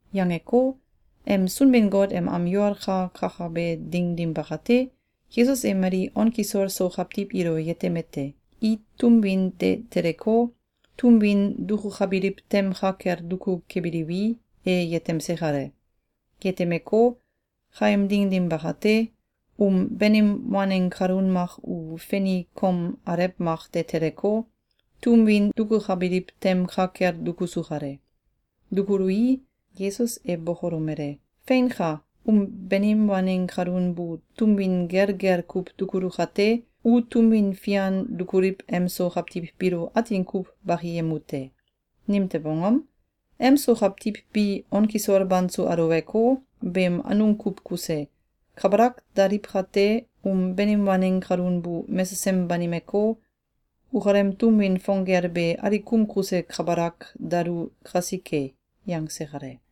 Yangeko, em Sunbin-Got em am yol ka kakabe ding dim bakate, Yesus e mali on kisol so kawtiw ilo yetemete: I tum win de teleko, tum win dukukabiliw tem ka kel duku kebiliwi, e yetemse kale. Yetemeko, kaem ding dim bakate, um banim waneng kalun mak u feni kom alew mak de teleko, tum win dukukabiliw tem ka kel dukusu kale. Dukului, Yesus e bokolomele: “Feinka! Um banim waneng kalun bu tum win gelgel kuw dukulu kate, u tum win fian dukuliw em so kawtiw biilo atin kuw bakiyemu te. Nimtew angom? Em so kawtiw bi on kisol banso aluweko, beem anung kuw kuse, kabalak daliw kate, um banim waneng kalun bu mesesem banimeko, ukalem tum win fong gel be alikum kuse kabalak dalu kasike.”, yangse kale.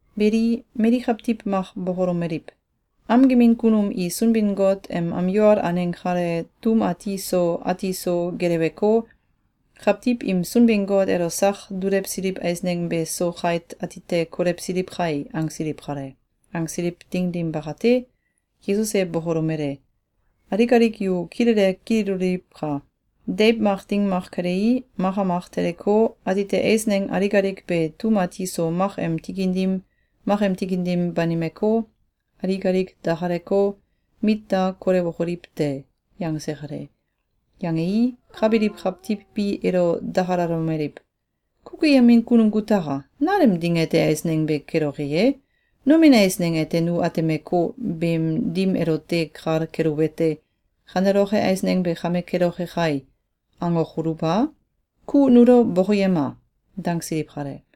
Beli, mali kawtiw mak bokolomeliw: “Am gemin kunum i Sunbin-Got em am yol aneng kale tum ati so ati so geleweko, kawtiw im Sunbin-Got elo sak dulewsiliw eisneng be so kait atite kolewsiliw kai!”, angsiliw kale. Angsiliw ding dim bakate, Yesus e bokolomele: “Alik alik yu kilele kililoliwka! Deiw mak ding mak kelei, maka mak teleko, atite eisneng alik alik be tum ati so mak em tikin dim, mak em tikin dim banimeko, alik alik dakaleko, mit da kolewokoliw te.”, yangse kale. Yangei, ka biliw kawtiw bi elo dakalalomeliw: “Kukuyemin kunum kutaka! Nalem ding ete eisneng be keloke ye? Nomin eisneng ete nu atemeko, beem dim elote kal keluwete: ‘Kaneloke eisneng be kame keloke kai!’, angokoluw a? Ku nulo bokoyema!”, dangsiliw kale.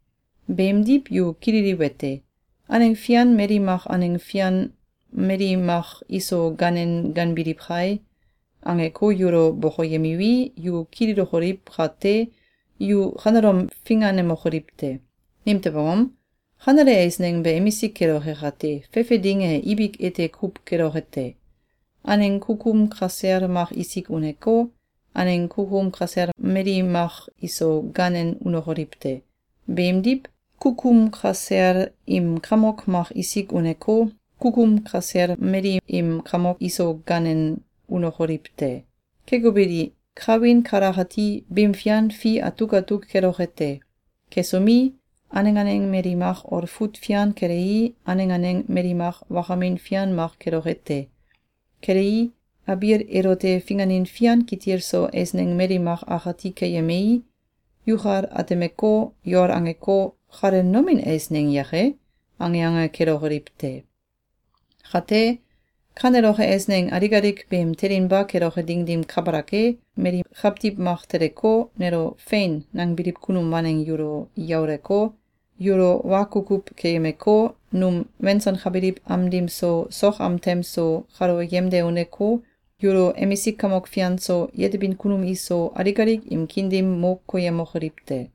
Beemdiw, yu kililiwete: ‘Aneng fian mali mak aneng fian mali mak iso ganen ganbiliw kai!’, angeko, yulo bokoyemiwi, yu kililokoliw kate, yu kanelom finganemokoliw te! Nimtew angom? Kanele eisneng be emisik keloke kate, fefe ding e ibik ete kuw keloke te. Aneng kukum kasel mak isik uneko, aneng kukum kasel mali mak iso ganen unokoliw te. Beemdiw, kukum kasel im kamok mak isik uneko, kukum kasel mali im kamok iso ganen unokoliw te. Keko beli, kawin kalakati bim fian fi atuk atuk keloke te. Kesomi, aneng aneng mali mak olfut fian kelei, aneng aneng mali mak wakamin fian mak keloke te. Kelei, abiil elote finganin fian kitil so eisneng mali mak akati keyemei, yukal atemeko, yol angeko, ‘Kale nomin eisneng yake?’, ange ange kelokoliw te. Kate, kaneloke eisneng alik alik beem telinba keloke ding dim kabalak e, mali kawtiw mak teleko, nelo ‘Fein!’, nangbiliw kunum waneng yulo yauleko, yulo wa kukuw keyemeko, num wensankabiliw am dim so, sok am tem so, kalo yemde uneko, yulo emisik kamok fian so, yetebin kunum iso, alik alik im kiin dim mo koyemokoliw te.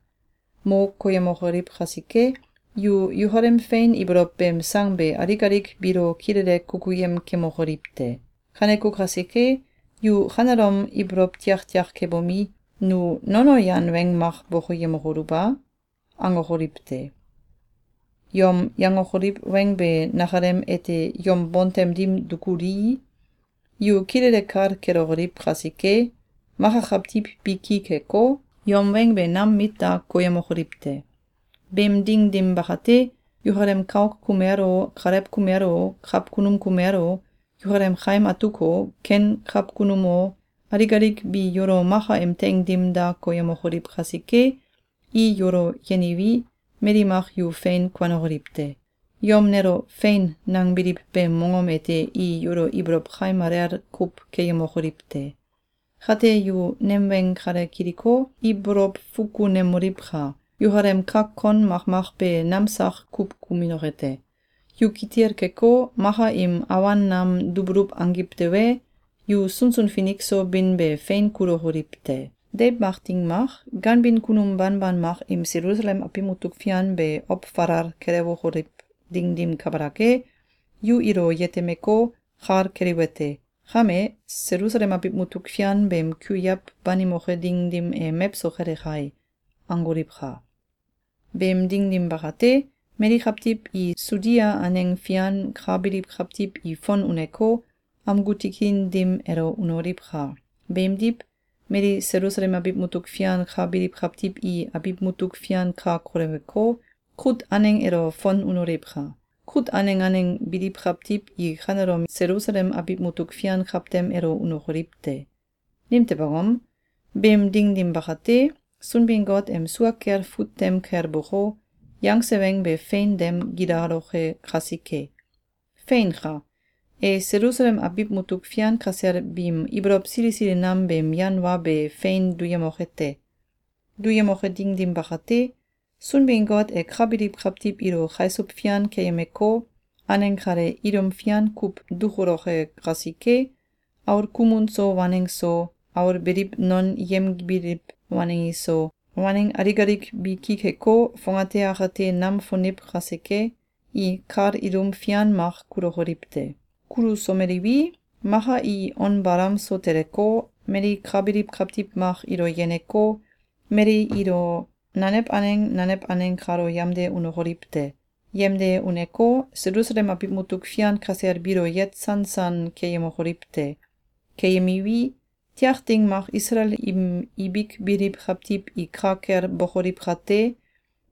Mo koyemokoliw kasike, yu yukalem fein ibolow beem sang be alik alik biilo kilele kukuyem kemokoliw te. Kaneko kasike, yu kanelom ibolow tiaktiak kebomi, ‘Nu nono yan weng mak bokoyemokoluw a?’, angokoliw te! Yom yangokoliw weng be nakalem ete yom bontem dim dukulii, yu kilele kal kelokoliw kasike, maka kawtiw bi ki keko, yom weng be nam mit da koyemokoliw te. Beem ding dim bakate, yukalem kauk kumel o, kalew kumel o, kawkunum kumel o, yukalem kaim atuk o, ken kawkunum o, alik alik bi yulo maka im teing dim da koyemokoliw kasike, i yulo yeniwi, mali mak yu fein kuanokoliw te. Yom nelo ‘Fein!’, nangbiliw beem mongom ete i yulo ibolow kaim alel kuw keyemokoliw te. Kate yu nem weng kale kiliko, ibolow fukunemoliwka! Yukalem kak kon makmak be nam sak kuw kuminoke te. Yu kitil keko, maka im awan nam dubuluw angiw tewe, yu sunsun finik so bin be fein kulokoliw te. Deiw mak ding mak, ganbin kunum banban mak im Selusalem abiw mutuk fian be ow falal kelewokoliw ding dim kabalak e, yu ilo yetemeko, kal keliwete: ‘Kame, Selusalem abiw mutuk fian beem kuiaw banimoke ding dim e mewso kele kai!’, angoliwka! Beem ding dim bakate, mali kawtiw i Sudia aneng fian ka biliw kawtiw i fon uneko, amgu tikin dim elo unoliwka! Beemdiw, mali Selusalem abiw mutuk fian ka biliw kawtiw i abiw mutuk fian ka koleweko, kut aneng elo fon unoliwka! Kut aneng aneng biliw kawtiw i kanelom Selusalem abiw mutuk fian kawtem elo unokoliw te! Nimtew angom? Beem ding dim bakate, Sunbin-Got em sua kel fut tem kel boko, yangse weng be fein dem gilaloke kasike. Feinka! E Selusalem abiw mutuk fian kasel biim ibolow sili sili nam beem yan wa be fein duyemoke te. Duyemoke ding dim bakate, Sunbin-Got e ka biliw kawtiw ilo kaisuw fian keyemeko, aneng kale ilum fian kuw dukuloke kasike, aul kumun so waneng so, aul beliw non yemgibiliw waneng iso, waneng alik alik bi ki keko, fongate akate nam foniw kasike, i kal ilum fian mak kulokoliw te. Kulusomeliwi, maka i on balam so teleko, mali ka biliw kawtiw mak ilo yeneko, mali ilo nanew aneng nanew aneng kalo yamde unokoliw te. Yamde uneko, Selusalem abiw mutuk fian kasel biilo yet sansan keyemokoliw te. Keyemiwi, tiak ding mak Isalael im ibik biliw kawtiw i ka kel bokoliw kate,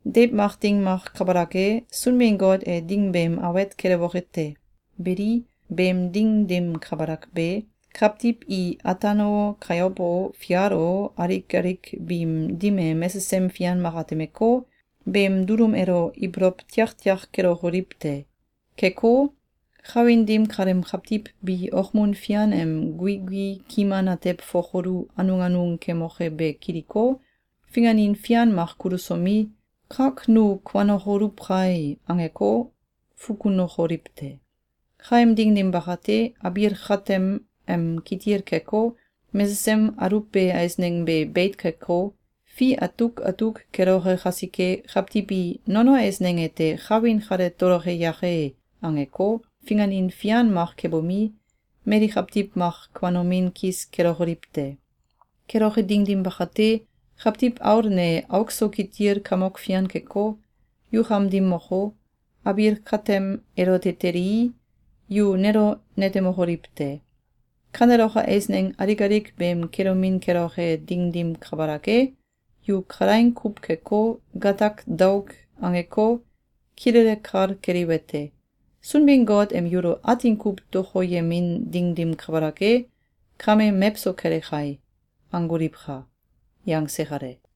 deiw mak ding mak kabalak e, Sunbin-Got e ding beem awet kelewoke te. Beli, beem ding dim kabalak be, kawtiw i ataan o, kayow o, fial o, alik alik biim dim e mesesem fian mak atemeko, beem dulum elo ibolow tiaktiak kelokoliw te. Keko, kawin dim kaleem kawtiw bi okmun fian em guigui kiman atew fokolu anung anung kemoke be kiliko, finganin fian mak kulusomi, ‘Kak nu kuanokoluw kai!’, angeko, fukunokoliw te. Kaem ding dim bakate, abiil katem em kitil keko, mesesem aluwbe eisneng be beit keko, fi atuk atuk keloke kasike, kawtiw i ‘Nono eisneng ete, kawin kale toloke yake!’, angeko, finganin fian mak kebomi, mali kawtiw mak kuanomin kis kelokoliw te. Keloke ding dim bakate, Kawtiw Aul ne auk so kitil kamok fian keko, yukam dim moko, abiil katem elote telii, yu nelo netemokoliw te. Kaneloke eisneng alik alik beem kelomin keloke ding dim kabalak e, yu kalaing kuw keko, gatak daok angeko, kilele kal keliwete: ‘Sunbin-Got em yulo atin kuw dokoyemin ding dim kabalak e, kame mewso kele kai!’, angoliwka!”, yangse kale.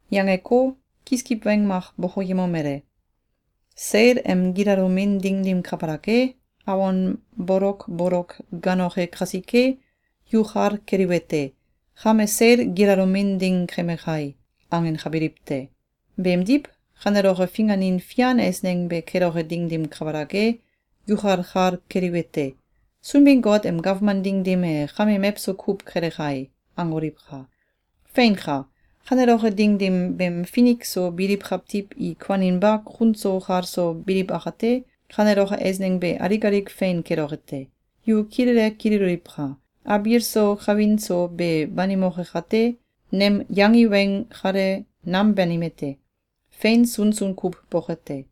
Yangeko, kiskiw weng mak bokoyemomele: “Seil em gilalomin ding dim kabalak e, awon bolokbolok gaanoke kasike, yu kal keliwete: ‘Kame seil gilalomin ding keme kai!’, angenkabiliw te. Beemdiw, kaneloke finganin fian eisneng be keloke ding dim kabalak e, yukal kal keliwete: ‘Sunbin-Got em gawman ding dim e kame mewso kuw kele kai!’, angoliwka! Feinka! Kaneloke ding dim beem finik so biliw kawtiw i kuaninba kun so kal so biliw akate, kaneloke eisneng be alik alik fein keloke te. Yu kilele kililoliwka! Abiil so kawin so be banimoke kate, nem yangi weng kale, nam banime te. Fein sunsun kuw boke te.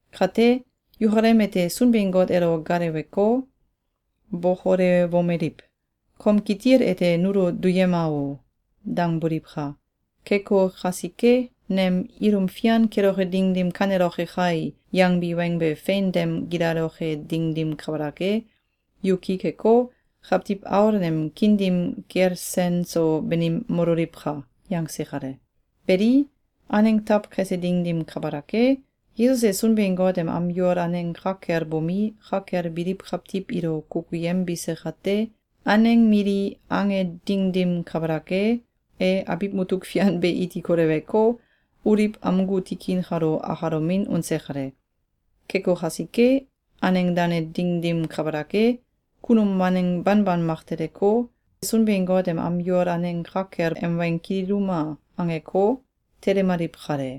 Kate, yukalem ete Sunbin-Got elo gaaleweko, bokolewmoliw: ‘Kom kitil ete nulo duyema o!’, dangboliwka! Keko kasike, nem ‘Ilum fian keloke ding dim kaneloke kai!’, yangbi weng be fein dem gilaloke ding dim kabalak e, yu ki keko, Kawtiw Aul nem kiin dim kel sen so banim mololiwka.”, yangse kale. Beli, aneng taw kese ding dim kabalak e, Yesus e Sunbin-Got em am yol aneng ka kel bomi, ka kel biliw kawtiw ilo kukuyembise kate, aneng mili ange ding dim kabalak e, e abiw mutuk fian be iti koleweko, Oliw amgu tikin kalo akalomin unse kale. Keko kasike, aneng dane ding dim kabalak e, kunum waneng banban mak teleko, Sunbin-Got em am yol aneng ka kel ‘Em weng kililuma!’, angeko, telemaliw kale.